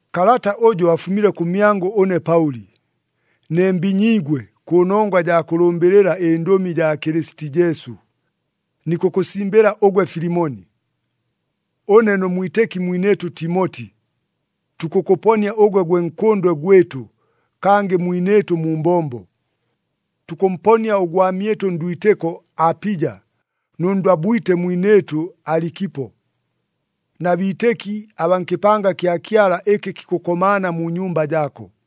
Kalata ʉjʉ afumile kʉmyangʉ ʉne Paʉli, ne mbinyiigwe kʉnongwa jaa kʉlʉmbɨlɨla ɨNdʉmi jaa Kɨlɨsiti Jesu, nikʉkʉsimbɨla ʉgwe Filimoni. Ʉne nʉ mwitɨki mwinɨɨtʉ Timoti, tukʉkʉponia ʉgwe gwe nkʉndwe gwɨtʉ kangɨ mwinɨɨtʉ mu mbombo. Tukʉmponia ʉgwamyɨtʉ ndwitɨko Apija nʉ ndwabwite mwinɨɨtʉ Alikipo, na biitɨki abaa nkɨpanga kya Kyala ɨkɨ kikʉkomaana mu nyumba jaako.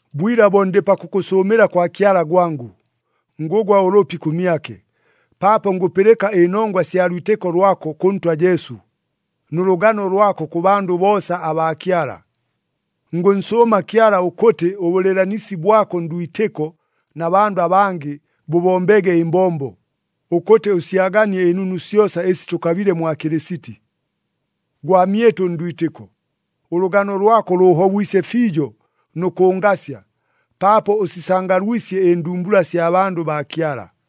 Bwila bo ndɨ pakʉkʉsʉʉmɨla kwa Kyala gwangʉ, ngʉgwa ʉlʉpi kʉmyake, paapo ngʉpɨlɨka ɨnongwa sya lwitɨko lwako kʉ Ntwa Jesu, nʉ lʉgano lwako kʉ bandʉ boosa abaa Kyala. Ngʉnsʉʉma Kyala ʉkʉtɨ ʉbʉlɨɨlanisi bwako ndwitɨko na bandʉ abangɨ bʉbombege ɨmbombo, ʉkʉtɨ ʉsyaganie ɨnunu syosa ɨsi tʉkabile mwa Kɨlɨsiti. Gwamyɨtʉ ndwitɨko, ʉlʉgano lwako lʉʉhobwisye fiijo nʉ kʉngasya, paapo ʉsisangalwisye ɨndumbula sya bandʉ baa Kyala.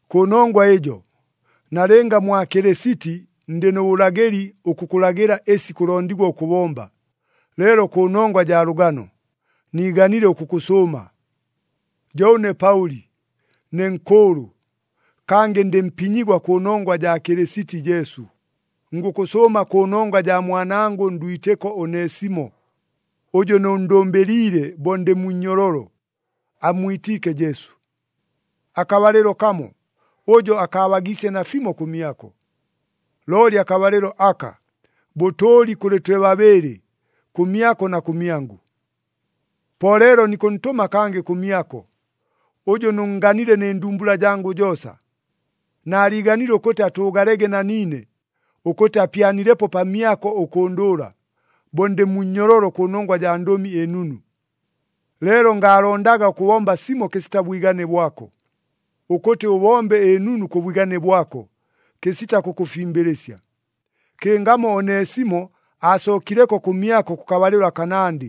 Kʉnongwa ɨjo, nalɨnga mwa Kɨlɨsiti ndɨ nʉ bʉlagɨli ʉkʉkʉlagɨla ɨsi kʉlondigwa ʉkʉbomba, leelo kʉnongwa jaa lʉgano, niiganile ʉkʉkʉsʉʉma. Jo ʉne Paʉli, ne nkʉʉlʉ, kangɨ ndɨ mpinyigwa kʉnongwa jaa Kɨlɨsiti Jesu, ngʉkʉsʉʉma kʉnongwa jaa mwanangʉ ndwitɨko Onesimo, ʉjʉ nʉnndʉmbɨliile bo ndɨ mu nnyololo, ammwitiike Jesu. Akabalɨlo kamo, ʉjo akaabagiisye nafimo kʉmyako. Looli akabalɨlo aka, bʉtʉʉli kʉlɨ twe babɨɨlɨ, kʉmyako na kʉmyangʉ. Po leelo nikʉntʉma kangɨ kʉmyako, ʉjʉ nʉnnganile nɨ ndumbula jangʉ joosa. Naaliiganile ʉkʉtɨ atʉʉgalege na niine, ʉkʉtɨ apyanilepo pamyako ʉkʉndʉʉla, bo ndɨ mu nnyololo kʉnongwa jaa Ndʉmi ɨNunu. Leelo ngaalondaga ʉkʉbomba simo kɨsita bwigane bwako, ʉkʉtɨ ʉbombe ɨnunu kʉ bwigane bwako, kɨsita kʉkʉfimbɨlɨsya. Kɨngamo Onesimo aasookileko kʉmyako kʉkabalɨlo akanandɨ,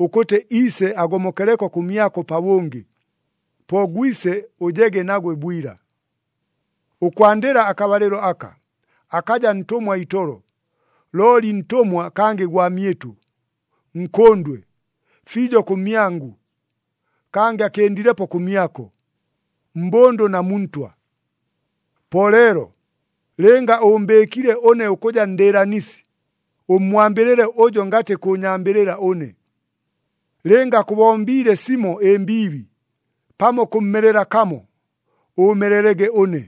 ʉkʉtɨ iise agomokeleko kʉmyako pabʉngɨ, po gwise ʉjege nagwe bwila. Ʉkwandɨla akabalɨlo aka, akaja ntʉmwa itolo, looli ntʉmwa kangɨ gwamyɨtʉ, nkʉndwe, fiijo kʉmyangʉ, kangɨ akɨndilepo kʉmyako, mbʉndʉ na mu Ntwa. Po leelo, lɨnga ʉʉmbɨɨkile ʉne ʉkʉja ndɨɨlanisi, ʉmmwambɨlɨle ʉjo ngatɨ kʉʉnyambɨlɨla ʉne. Lɨnga akʉbombiile simo ɨmbiibi, pamo kʉmmelela kamo, ʉʉmelelege ʉne.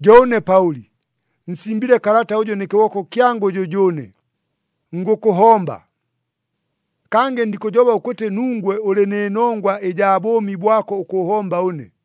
Jo ʉne Paʉli, nsimbile kalata ʉjʉ nɨ kɨboko kyangʉ jʉjʉʉne, ngʉkʉhomba. Kangɨ ndikʉjoba ʉkʉtɨ nungwe ʉlɨ nɨ nongwa ɨjaa bʉʉmi bwako ʉkʉʉhomba ʉne.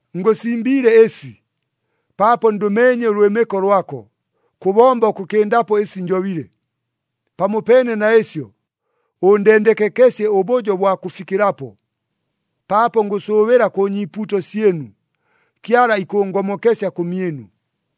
Ngʉsimbiile ɨsi, paapo ndʉmeenye ʉlwɨmɨko lwako, kʉbomba ʉkʉkɨndapo ɨsi njobile. Pamopeene na ɨsyo, ʉndendekekesye ʉbʉjo bwa kʉfikɨlapo, paapo ngʉsʉʉbɨla kʉ nyiipuuto syɨnu, Kyala ikʉʉngomokesya kʉmyɨnu.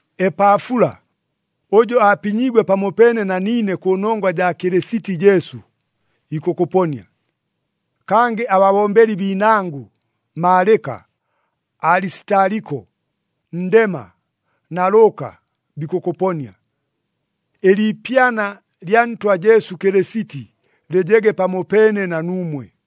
Epaafula, ʉjʉ apinyiigwe pamopeene na niine kʉnongwa jaa Kɨlɨsiti Jesu, ikʉkʉponia. Kangɨ ababombeli biinangʉ Maalɨka, Alisitaliko, Ndema na Lʉʉka, bikʉkʉponia. Ɨliipyana lya Ntwa Jesu Kɨlɨsiti lɨjege pamopeene na nuumwe.